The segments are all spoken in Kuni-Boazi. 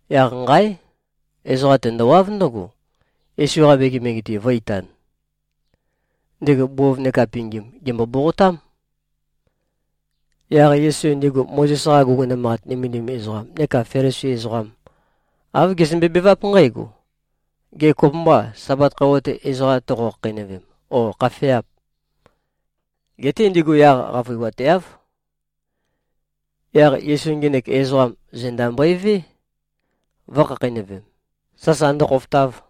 Yaq nqáe! Ezoqa tendowáv ndǿgo, Yesu-qa megemege-te vō꞉-itan. Ndego bov neka pingim gèmbo-boqotám. Yaq Yesu ndigu Mozes-qa guguna manqat nømendim ezoqam neka Felisi ezoqam, āv gezømbe-beváp nqǽgo, “Gê, kopømbâ, Sabat khøuwa-te ezoqa toqo-khakheinøvem, ó, khafeâp?” Geté ndigu yaq qavøiwateáv. Yaq Yesu ngenek ezoqam, zenda mbøevé, vø̄khakheinøvem, sasa ndøkhofotav.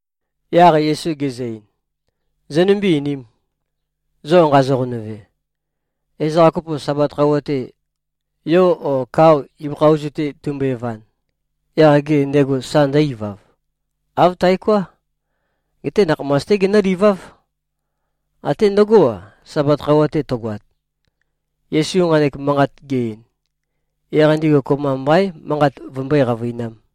Yaq Yesu gezø-ein, “Zonømbé-einīm. Zo nqazo-qonøve, ezoqa kopo, Sabat khøuwa-te, yo o kao ibøkha ozu-te tumbøe-van, yaq gê, ndego sa ndǿ-ivav? Āv taoká. Geté nakhamas-té genǿliváv. Até ndøgó-a, Sabat khøuwa-te tøgoat.” Yesu nqanek manqat ge-ein, yaq ndigu kopømba mbaín, manqat vømbøé-qavøinām.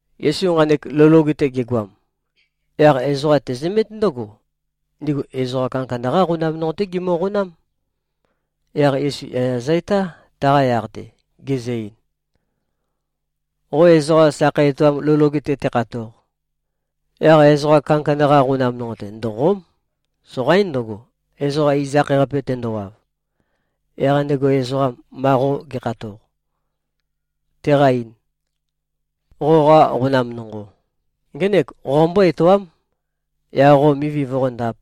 Yesu nqanek lou loge-te gegoam, yaq ezoqa tezømét ndǿgo, ndigu ezoqa kandakanda-qá qonam nonqo-té gimøqonám. Yaq Yesu yaya zø-etá, taqa yaq-te, gezø-ein, “Qo ezoqa sakhei etoam lou loge-te tekhatoq, yaq ezoqa kandakanda-qa qonam nonqo-te ndòqo᷄m. Soqaín ndøgo, ezoqa iz-akhae-qape tendowav, yaq ndego ezoqam, ma qo ge꞉khatoq, teqa-ein, ‘Qoqa qonam nonqo, ngēnek qombō-etoām,’ yaq qo mivi voqóndāp,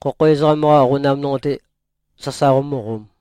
khokho ezoqam-qa qonam nonqo-te sasa qomǿqōm.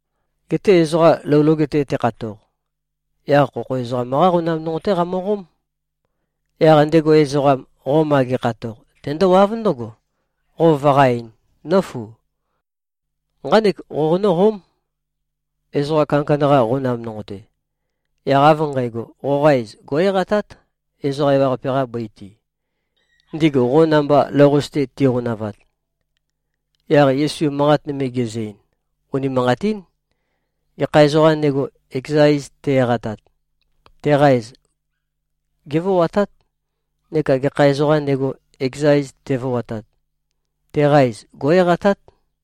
Geté ezoqa lou loge-te tekhatoq, yaq khokho ezoqam-qá qonam nonqo-té qamøqóm. Yaq ndego ezoqam, qo ma ge꞉khatoq, tendówáv ndǿgo, qo vøqá-eīn, ‘Nǿfu. Nqánek qoqonǿ-qóm, ezoqa kandakanda-qa qonam nonqo-te.’ Yaq av nqægo, qoqa iz gó꞉-eqatát, ezoqa ewaqape-qa bøi-te, ndigu qo namba lou-qase-te tiqonavat.” Yaq Yesu manqat nøme gezø-ein, “Unimanqatín. Gekha ezoqām ndego, ekeza iz te-eqatat, teqa iz gévoatát. Neka gekha ezoqām ndego, ekeza iz tevoatat, teqa iz gó꞉-eqatát.”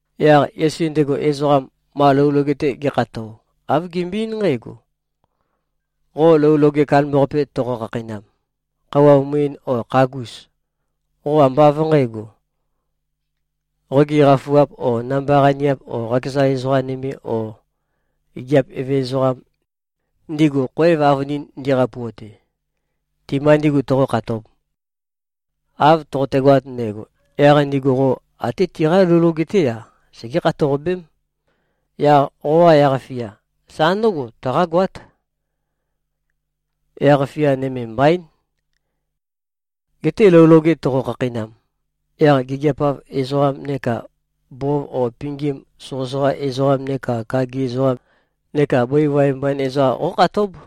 Yaq Yesu ndego ezoqam, ma lou loge-te ge꞉khato, āv gembøe-eín nqǽgo, “Qo lou loge kandambaqape toqo-khakheinam, khøuwa muin o khagus, qo ambá av nqǣgo, qogi qafuap o namba-qaniap o qakeza ezoqa nøme o gigiap eve ezoqam, ndigu khoev avønin ndiqapuate, ti-mba ndígu toqókhatōb. Av toqotegoat ndægo, yaq ndigu qo até tiqá lou loge-té-a, segé-khatoqabém. Yaq qoqa yaq-fia sa ndǿgo tøqágoát. Yaq-fia nøme mbaín. Geté lou loge toqo-khakheinam, yaq gigiap-av ezoqam neka bov o pingim soqøsoqa ezoqam neka kagi ezoqam neka bøi waev mbain ezoqam qókhatób.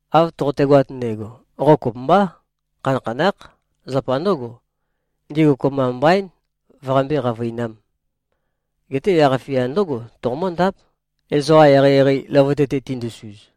Av toqotegoat ndægo, qo kopømbá, khanakhanákh. Zapa ndǿgo, ndigu kopømba mbaín vøqambé-qavøinām. Geté yaq-fia ndǿgo toqomǿndáp, ezoqa eqeieqei løvøte-te tindusuz.”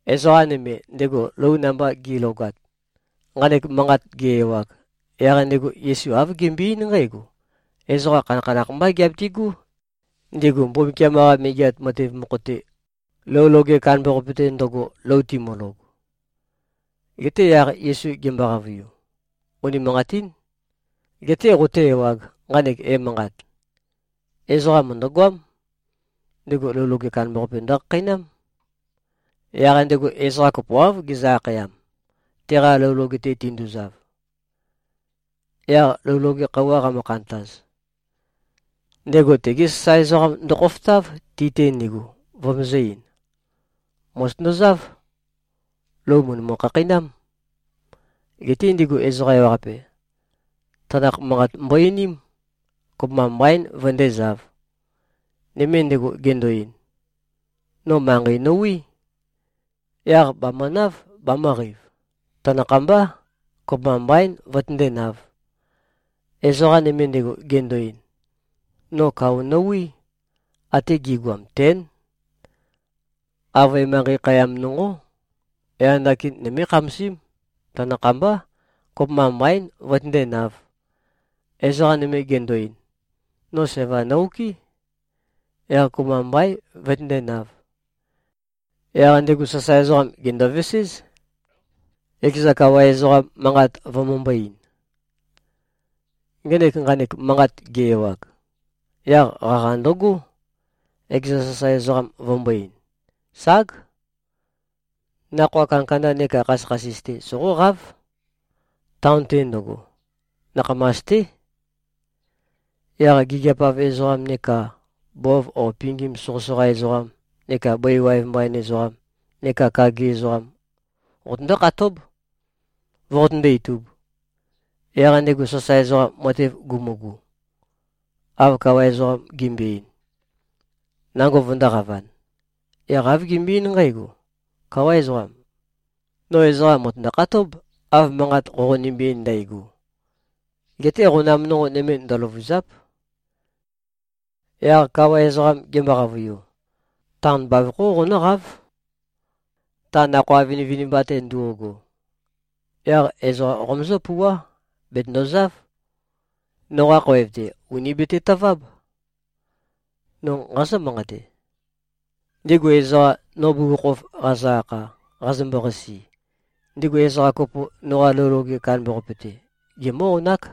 Ezoqa nøme, ndego lou namba gi꞉logat, nqanek manqat ge-ewag, yaq ndego Yesu āv gembøe-eín nqǽgo, “Ezoqa khanakhanakh mbá giabitigú, ndigu Mbumbukiam-qa Megeat Matev mokho-te, lou loge kandambaqape-te ndøgo, lou timølog.” Geté yaq Yesu gembo-qavøiu, “Unimanqatín. Geté qoté-ewāg, nqanek emanqat: Ezoqa mø̀ndøgoám. Ndego lou loge kandambaqape ndøkhakheinám. Yaq ndego ezoqa kopoáv gezø-akhayam, teqa lou loge-te tinduzav. Yaq lou loge khøuwa qamø-khantaz, ndego tege sasae ezoqam ndøkhofotáv, ti-te ndigu, vømøzø̄-ein, ‘Mòzotøndozáv. Lou mø̀ndømu-khakheinám.’ Geté ndigu ezoqa ewaqape, tanakh manqat mbo-einím. Kopømba mbaín vøndézāv. Nøme ndego gendo-ein, ‘No manqei nowí. Yaq bàmønáv, bamø̄qeiv. Tanakhambá. Kopømba mbaín, vøtøndénāv.’ Ezoqa nøme ndego gendo-ein, ‘No kao nowí. Ate gi꞉goam tén. Avøe manqei khayam nonqó. Yaq ndakin nømé-khamasím. Tanakhambá. Kopømba mbaín, vøtøndénāv.’ Ezoqa nøme gendo-ein, ‘No sævam no-okɨ́. Yaq kopømba mbaín, vøtøndénāv.’ Yaq ndego sasae ezoqam gèndoveséz, ekeza kawa ezoqam, manqat vømømbō-ein. Ngenek nqanek manqat ge-ewag, yaq qaqa ndøgó, ekeza sasae ezoqam vømbō-ein, ‘Ság. Nakhoa kandakanda neka khasøkhasis-té soqóqáv, taon-te ndøgo. Nakhamas-té. Yaq gigiap-av ezoqam neka bov o pingim soqøsoqa ezoqam neka bøi waev mbain ezoqam neka kagi ezoqam qotøndó-khatób, voqotøndó-itūb.’ Yaq ndego sasae ezoqam matev gumugu, av kawa ezoqam gembøe-ein, nango vøndōqavan, yaq āv gembøe-eín nqǽgo, ‘Káwa ezoqam. No ezoqa mø̀tøndo-khatób, av manqat qoqonømbe-ein ndægo. Geté qonam nonqo nøme, ndøløvûzáp.’ Yaq kawa ezoqam gembo-qavøiu, ‘Taon bavokhó qonǿqáv, ta nakhoa vinivinimba-te ndo꞉go. Yaq ezoqa qomøzǿ-pouwá. Bètøndozáv. Noqa khoev-te, ùni betetøváb. No nqazǿ-manqate: Ndigu ezoqam, no bugukhokhof qazø-akha, qazømbo-qasi, ndigu ezoqa kopo, noqa lou loge kandambaqape-te, gemǿ-onák.’”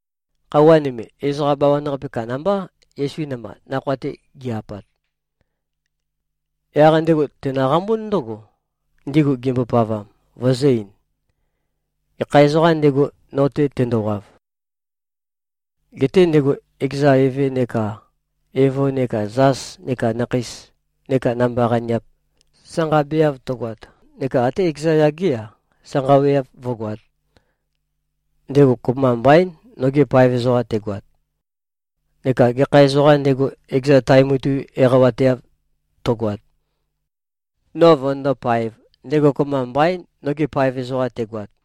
Khøuwa nøme, ezoqa bawan-qape kandambá, Yesu namba nakhoa-te gi-apat. Yaq ndego tènøqambún ndǿgo, ndigu gimbopavam, vøzø̄-ein, “Gekha ezoqām ndego, no-te tendowav, gete ndego ekeza eve neka evo neka zas neka nakheis neka namba-qaniap sanqabeav tøgoat neka atē ekeza yagé-a, sanqaweav vǿgoāt, ndego kopømba mbaín, noge paev ezoqam tegoat. Neka gekha ezoqām ndego, ekeza tae mutui eqawateav tøgoat, no vønøndó-paēv, ndego kopømba mbaín, noge paev ezoqam tegoat.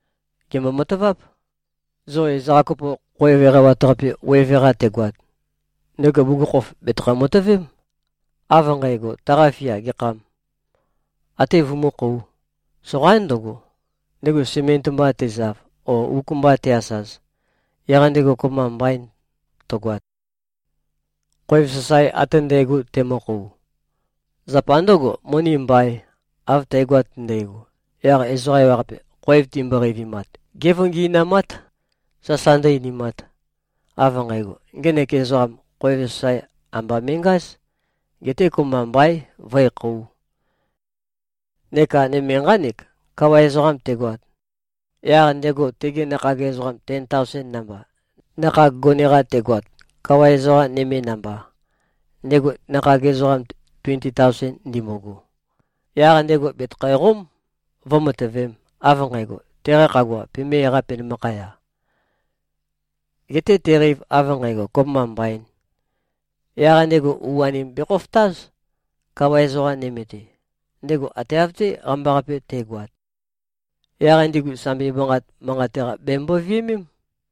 Gèmbo-mataváp. Zo ezoqa kopo, khoev eqawat-qape weve-qa tegoat, ndego bugukhokhof bètøkho-matøvém, av nqægo, taqa fia gekhâm, até vømúkhōu. Soqaín ndøgo, ndego sement mba tezav o uk mba te-asaz, yaq ndego kopømba mbain tøgoat, khoev sasae ate ndægo temøkhou, zapa ndø̄go, moni mbaīn. Av tægoat ndægo, yaq ezoqa ewaqape, khoev timbo-qeivimat, gévøngi꞉namát, sasa ndǿ-einimāt, av nqægo, ‘Ngenek ezoqam khoev sasae amba me꞉ngáz. Geté kopømba mbaín, vǿekhōu.’ Neka nøme nqánek: Kawa ezoqam tegoat, yaq ndego tegi nakhag ezoqam ten taosen namba, nakhag gone-qa tegoat, kawa ezoqa nøme namba, ndego nakhag ezoqam tuenti taosen ndimbugu, yaq ndego bètøkhæqóm, vǿmatøvēm, av nqægo, teqa khagua pemé-eqā, penømakhaya. Geté teqeiv av nqægo, kopømba mbaīn, yaq ndego u-anim bekhofotáz, kawa ezoqa nøme-te, ndego ate av-té qambaqape te꞉goat. Yaq ndigu sambi manqat manqate-qa bemømbo-viømém.”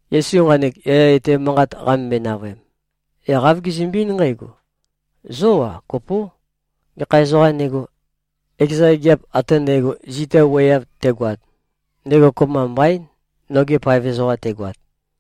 Yesu nqanek yaya etæ manqat qamømbøe-navøem, yaq āv gezømbe-eín nqǽgo, “Zó-a, kopó. Gekha ezoqām ndego, ekeza gigiap ate ndægo, zita wuøeav tegoat, ndego kopømba mbaín, noge paev ezoqam tegoat.”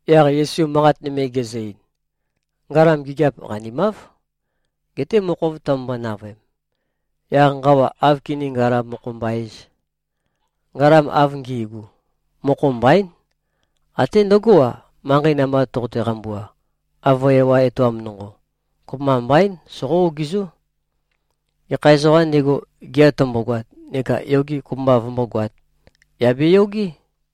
Yaq Yesu manqat nøme gezø-ein, “Ngalam gigiap qanimáv. Geté mokhov tømømbo-navøem, yaq nqawa áv kiní-ngalam-mokho-mba-ēz? Ngalam av ngi꞉gu, mokho mbaín. Até ndøgó-a, manqei namba toqote-qambua, avøe ewa etoam nonqo, kopømba mbaín. Soqó-ogizó. Gekha ezoqām ndego, gea tømbogoat neka yoge kopømba vømbógoāt, yà beyogé!”